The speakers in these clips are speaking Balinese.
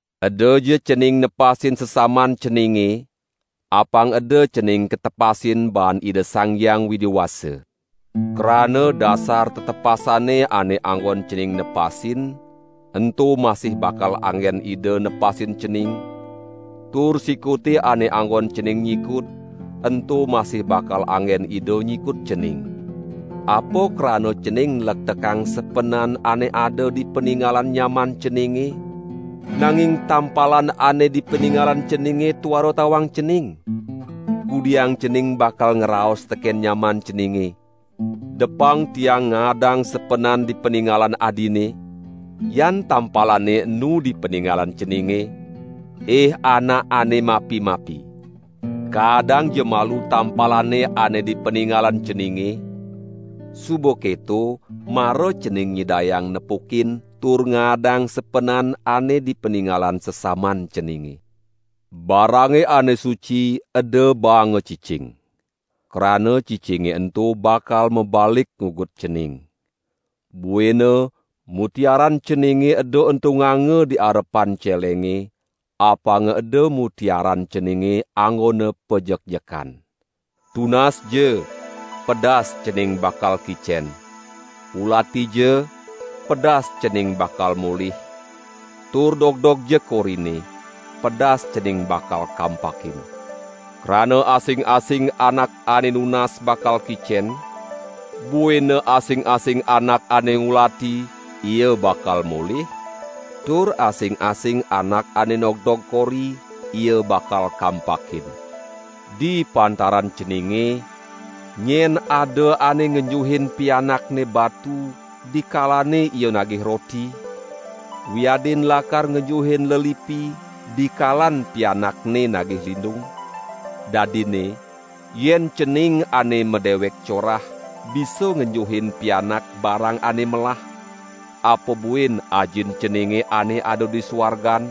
"Edaja cening nepasin sesaman ceninge, apang eda cening katepasin baan Ida Sang Hyang Widi Wasa. Krana dasar tetepasane ane anggon cening nepasin, ento masih bakal anggen Ida nepasin cening, tur sikute ane anggon cening nyikut, ento masih bakal anggen Ida nyikut cening. Apa krana cening nlektekang sepenan ane ada di paningalan nyaman ceninge, nanging tampalan ane di paningalan ceninge tuara tawang cening? Kudiang cening bakal ngraos teken nyaman ceninge: 'Depang tiang ngaadang sepenan di paningalan adine,' yan tampalane enu di paningalan ceninge? Ih anak ane mapi-mapi. Kadangja malu tampalane ane di paningalan ceninge, suba keto mara cening nyidayang nepukin tur ngaadang sepenan ane di paningalan sesaman ceninge. Barange ane suci eda baanga cicing. Krana cicinge ento bakal mabalik ngugut cening. Buina mutiaran ceninge eda entunganga di arepan celenge, apanga eda mutiaran ceninge anggona pajekjekan." "Tunasja, pedas cening bakal kicen; ulatija pedas cening bakal molih; tur dogdogja korine, pedas cening bakal kampakin. Krana asing-asing anak ane nunas bakal kicen, buina asing-asing anak ane ngulati, ia bakal molih, tur asing-asing anak ane nogdog kori, ia bakal kampakin. Di pantaran ceninge, nyen ada ane ngenjuhin pianakne batu, dikalane ia nagih roti? Wiadin lakar ngenjuhin lelipi, dikalan pianakne nagih lindung? Dadinne yen cening ane madewek corah, bisa ngenjuhin pianak barang ane melah, apa buin Ajin ceninge ane ada di suargan,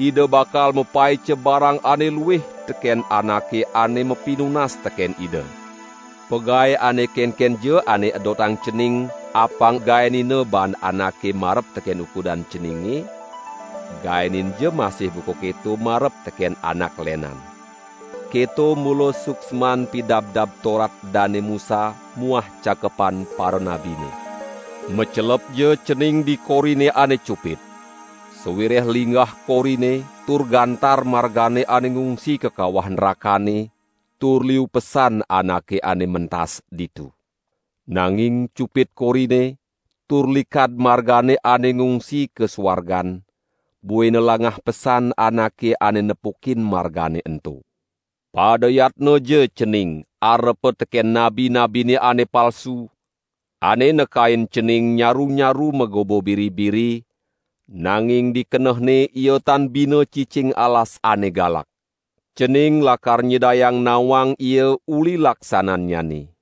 Ida bakal mapaica barang ane luih teken anake ane mapinunas teken Ida. Pagae ane kenkenja ane edotang cening apang gaenina baan anake marep teken ukudan ceninge, gaeninja masih buka keto marep teken anak lenan. Keto mula suksman Pidabdab Torat Dane Musa muah cakepan paranabine." "Macelepja cening di korine ane cupit. Sawireh linggah korine tur gantar margane ane ngungsi ka kawah nrakane, tur liu pesan anake ane mentas ditu. Nanging cupit korine tur likad margane ane ngungsi ka suargan, buina langah pesan anake ane nepukin margane ento." "Pada yatnaja cening arepa teken nabi-nabine ane palsu, ane nekain cening nyaru-nyaru magoba biri-biri, nanging di kenehne ia tan bina cicing alasan ane galak. Cening lakar nyidayang nawang ia uli laksanannyane.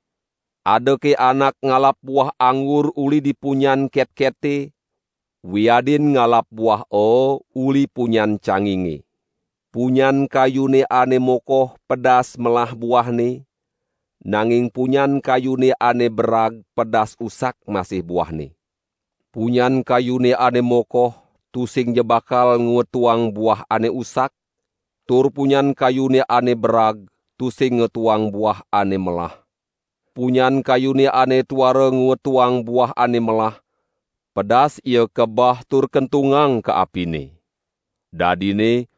Adake anak ngalap buah anggur uli di punyan ketkete, wiadin ngalap buah aa uli punyan canginge. Punyan kayune ane mokoh pedas melah buahne, nanging punyan kayune ane berag pedas usak masih buahne. Punyan kayune ane mokoh tusingja bakal ngwetuang buah ane usak tur punyan kayune ane berag tusing ngwetuang buah ane melah. Punyan kayune ane tuara ngwetuang buah ane melah, pedas ia kabah tur kentungang ka apine. Dadinne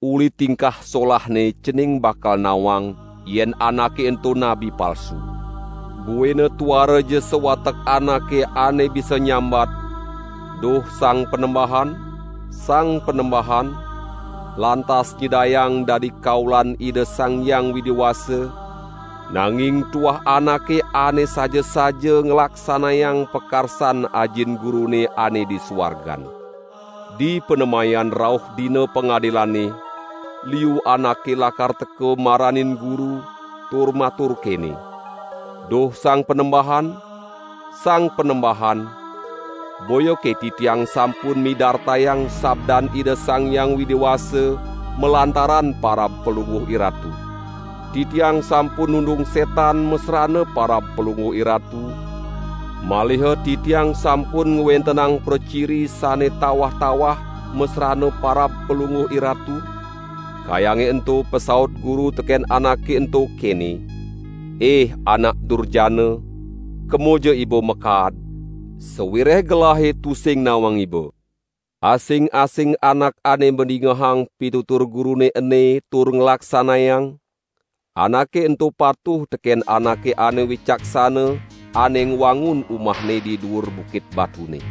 uli tingkah solahne cening bakal nawang yen anake ento nabi palsu." "Buina tuaraja sawatek anake ane bisa nyambat: Duh Sang Panembahan, Sang Panembahan, lantas nyidayang dadi kaulan Ida Sang Hyang Widi Wasa, nanging tuah anake ane saja-saja nglaksanayang pakarsan Ajin Gurune ane di suargan. Di panemayan rauh Dina Pangadilane liu anake lakar teka maranin Guru tur matur kene: 'Duh Sang Panembahan, Sang Panembahan, boyake titiang sampun midartayang sabdan Ida Sang Hyang Widi Wasa malantaran parab Palungguh IRatu. Titiang sampun nundung setan masrana parab Palungguh IRatu, maliha titiang sampun ngwentenang praciri sane tawah-tawah masrana parab Palungguh IRatu?' Kayange ento pasaut Guru teken anake ento kene: 'Ih anak durjana, kemoja iba makaad, sawireh Gelahe tusing nawang iba.' "Asing-asing anak ane madingehang pitutur Gurune ene tur nglaksanayang, anake ento patuh teken anake ane wicaksana, ane ngwangun umahne di duur bukit batune.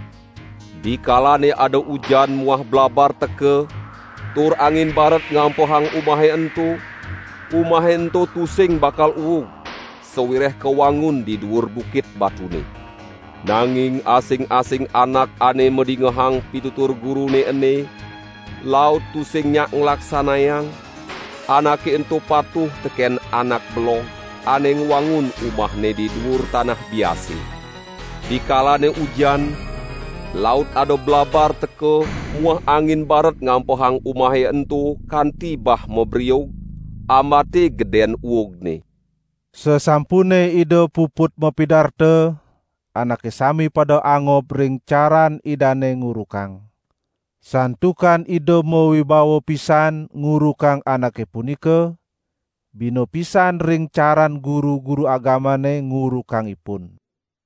Dikalane ada ujan muah blabar teka, tur angin baret ngampehang umahe ento, umahe ento tusing bakal uug, sawireh kawangun di duur bukit batune. Nanging asing-asing anak ane madingehang pitutur Gurune ene, laut tusing nyak nglaksanayang, anake ento patuh teken anak belog ane ngwangun umahne di duur tanah biase. Dikalane ujan, laut ada blabar teka muah angin baret ngampehang umahe ento kanti bah mabriug, ambate geden uugne." Sasampune Ida puput mapidarta, anake sami pada angob ring caran Idane ngurukang, santukan Ida mawibawa pisan ngurukang anake punika, bina pisan ring caran guru-guru agamane ngurukang ipun.